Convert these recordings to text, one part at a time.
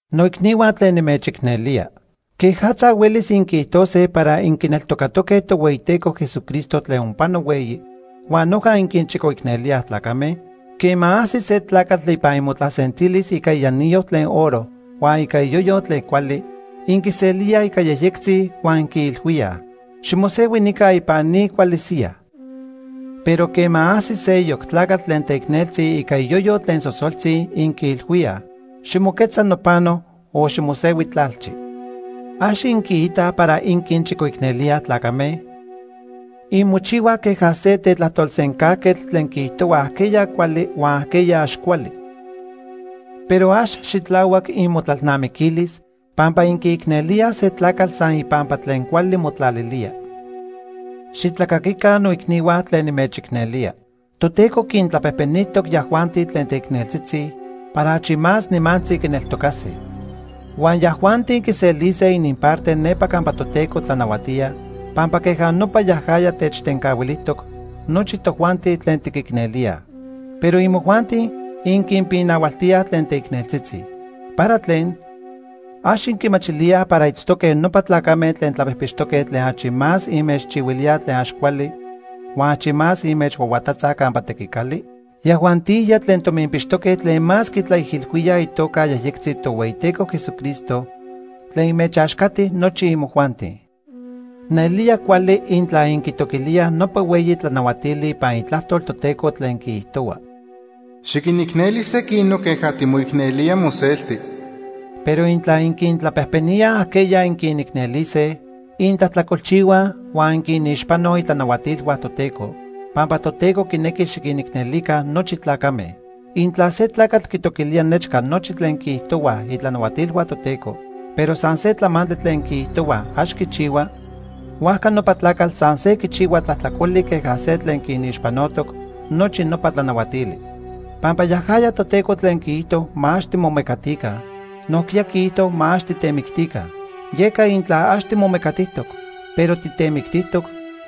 Noicnihua tlen nimechicnelía. ¿Quejatza huelis inquiijtose para inquineltocatoque Tohueyiteco Jesucristo tlen onpano hueyi, huan noja inquinchicoicnelíaj tlacame? Quema ajsi se tlacatl ipan inmotlasentilis ica ianillo tlen oro huan ica iyoyo tlen cuali, inquiselíaj ica yejyectzi huan inquiilhuíaj: “Ximosehui nica ipan ni cuali siyaj.” Pero quema ajsis seyoc tlacatl tlen teicneltzi ica iyoyo tlen sosoltzi, inquiilhuíaj: “Ximoquetza nopano o ximosehui tlalchi.” ¿Ax inquiitaj para inquinchicoicnelíaj tlacame? Inmochihuaj queja se tetlajtolsencajquetl tlen quiijtohua ajqueya cuali huan ajqueya ax cuali. Pero ax xitlahuac inmotlalnamiquilis pampa inquiicnelíaj se tlacatl san ipampa tlen cuali motlalilía. Xitlacaquica, noicnihua, tlen nimechicnelía. Toteco quintlapejpenijtoc yajuanti tlen teicneltzitzi para achi más nimantzi quineltocase. Huan yajuanti quiselise ininparte nepa campa Toteco tlanahuatía, pampa queja nopa yajaya techtencahuilijtoc nochi tojuanti tlen tiquicnelíaj. Pero imojuanti inquinpinahualtíaj tlen teicneltzitzi. ¿Para tlen? ¿Ax inquimachilíaj para itztoque nopa tlacame tlen tlapijpixtoque tlen achi más inmechchihuilíaj tlen ax cuali huan achi más inmechhuahuatatzaj campa tequicali? Yajuantijya tlen tominpixtoque tlen más quitlaijilhuíaj itoca yejyectzi Tohueyiteco Jesucristo tlen inmechaxcati nochi imojuanti. Nelía cuali intla inquitoquilíaj nopa hueyi tlanahuatili ipan Itlajtol Toteco tlen quiijtohua: “Xiquinicneli sequinoc queja timoicnelía moselti.” Pero intla inquintlapejpeníaj ajqueya inquinicnelise, intlajtlacolchihuaj huan inquinixpanoj itlanahuatilhua Toteco, pampa Toteco quinequi xiquinicnelica nochi tlacame. Intla se tlacatl quitoquilía nechca nochi tlen quiijtohuaj itlanahuatilhua Toteco, pero san se tlamantli tlen quiijtohuaj ax quichihua, huajca nopa tlacatl san se quihuica tlajtlacoli queja se tlen quinixpanotoc nochi nopa tlanahuatili. Pampa yajaya Toteco tlen quiijto ma ax timomecatica, nojquiya quiijto ma ax titemictica. Yeca intla ax timomecatijtoc, pero titemictijtoc,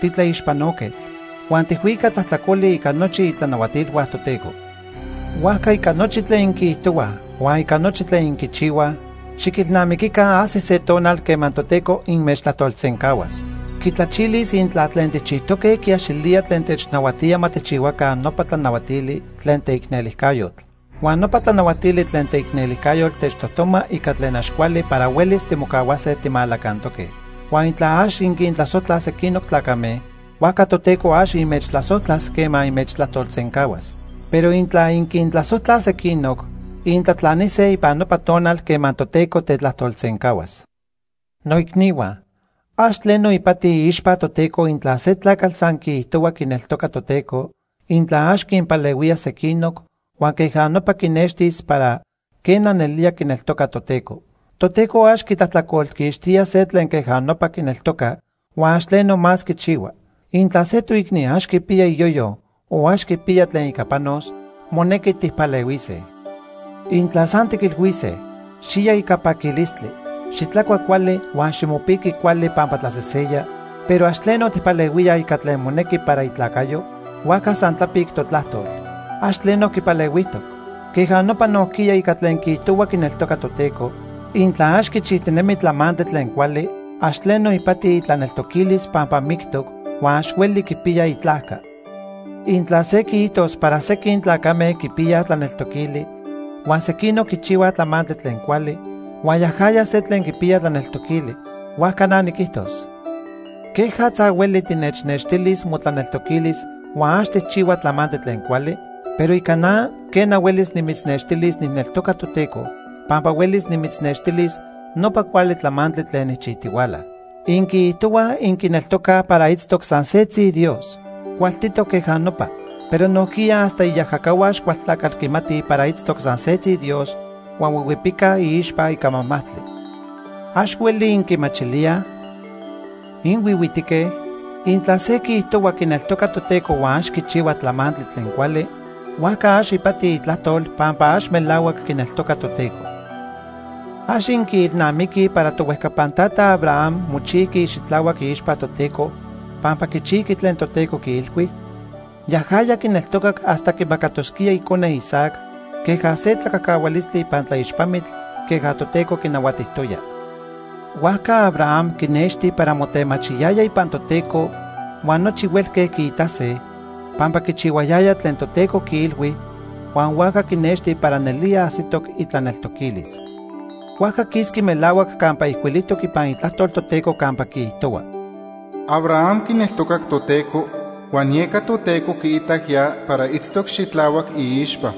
titlaixpanoquetl. Huan tijhuica tlajtlacoli ica nochi itlanahuatilhua Toteco. Huajca ica nochi tlen inquiijtohuaj huan ica nochi tlen inquichihuaj, xiquilnamiquica ajsis se tonal quema Toteco inmechtlajtolsencahuas. Quitlachilis intla tlen tijchijtoque quiaxilía tlen technahuatía ma tijchihuaca nopa tlanahuatili tlen teicnelijcayotl. Huan nopa tlanahuatili tlen teicnelijcayotl techtojtoma ica tlen ax cuali para huelis timocahuase timalacantoque. Huan intla ax inquintlasojtlaj sequinoc tlacame, huajca Toteco ax inmechtlasojtlas quema inmechtlajtolsencahuas. Pero intla inquintlasojtlaj sequinoc, intlatlanise ipan nopa tonal quema Toteco tetlajtolsencahuas. Noicnihua, ax tleno ipati iixpa Toteco intla se tlacatl san quiijtohua quineltoca Toteco, intla ax quinpalehuía sequinoc huan queja nopa quinextis para, quena, nelía quineltoca Toteco. Toteco ax quitlajtlacolquixtía se tlen queja nopa quineltoca, huan ax tleno más quichihua. Intla se toicni ax quipiya iyoyo o ax quipiya tlen ica panos, monequi tijpalehuise. Intla san tiquilhuise: “Xiya ica paquilistli, xitlacua cuali, huan ximopiqui cuali pampa tlaseseya”, pero ax tleno tijpalehuíaj ica tlen monequi para itlacayo, huajca san tlapic totlajtol. Ax tleno quipalehuijtoc. Queja nopa nojquiya ica tlen quiijtohua quineltoca Toteco, intla ax quichijtinemi tlamantli tlen cuali, ax tleno ipati itlaneltoquilis pampa mictoc huan ax hueli quipiya itlajca. Intla se quiijtos para sequin tlacame quipiyaj tlaneltoquili huan sequinoc quichihuaj tlamantli tlen cuali, huan yajaya se tlen quipiya tlaneltoquili, huajca na niquijtos: ¿quejatza hueli tinechnextilis motlaneltoquilis huan ax tijchihua tlamantli tlen cuali? Pero ica na, quena, huelis nimitznextilis nijneltoca Toteco, pampa huelis nimitznextilis nopa cuali tlamantli tlen nijchijtihuala. Inquiijtohuaj inquineltocaj para itztoc san setzi Dios. Cualtitoc queja nopa. Pero nojquiya hasta iajacahua Axcualtlacatl quimatij para itztoc san setzi Dios huan huihuipicaj iixpa ica majmajtli. ¿Ax hueli inquimachilíaj? ¿Inhuihuitique? Intla se quiijtohua quineltoca Toteco huan ax quichihua tlamantli tlen cuali, huajca ax ipati itlajtol pampa ax melahuac quineltoca Toteco. ¿Ax inquiilnamiquij para tohuejcapan tata Abraham mochijqui xitlahuac iixpa Toteco pampa quichijqui tlen Toteco quiilhui? Yajaya quineltocac hasta quimacatosquía icone, Isaac, queja se tlacajcahualistli ipan tlaixpamitl queja Toteco quinahuatijtoya. Huajca Abraham quinexti para motemachiyaya ipan Toteco huan nochi huelque quiitase, pampa quichihuayaya tlen Toteco quiilhui huan huajca quinexti para nelía ajsitoc itlaneltoquilis. Huajca quisqui melahuac campa ijcuilijtoc ipan Itlajtol Toteco campa quiijtohua: “Abraham quineltocac Toteco, huan yeca Toteco quiitac ya para itztoc xitlahuac iixpa.”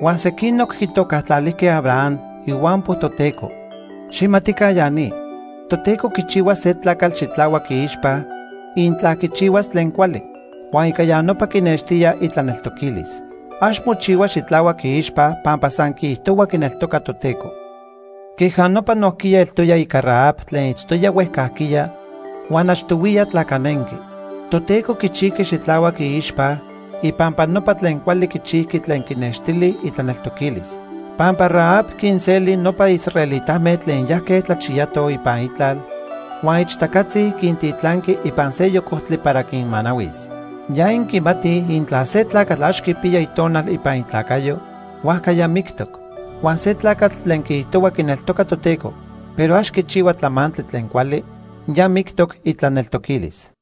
Huan sequinoc quitocatlalijque Abraham “ihuampo Toteco”. Xijmatica ya ni, Toteco quichihua se tlacatl xitlahuac iixpa intla quichihuas tlen cuali, huan ica ya nopa quinextía itlaneltoquilis. Ax mochihua xitlahuac iixpa pampa san quiijtohua quineltoca Toteco. Queja nopa nojquiya eltoya ica Rahab tlen itztoya huejcajquiya huan achtohuiya tlacanenqui. Toteco quichijqui xitlahuac iixpa ipampa nopa tlen cuali quichijqui tlen quinextili itlaneltoquilis. Pampa Rahab quinseli nopa israelitame tlen yajque tlachiyatoj ipan itlal huan ixtacatzi quintitlanqui ipan seyoc ojtli para quinmanahuis. Ya inquimatij intla se tlacatl ax quipiya itonal ipan itlacayo, huajca ya mictoc. Huan se tlacatl tlen quiijtohua quineltoca Toteco, pero ax quichihua tlamantli tlen cuali, ya mictoc itlaneltoquilis.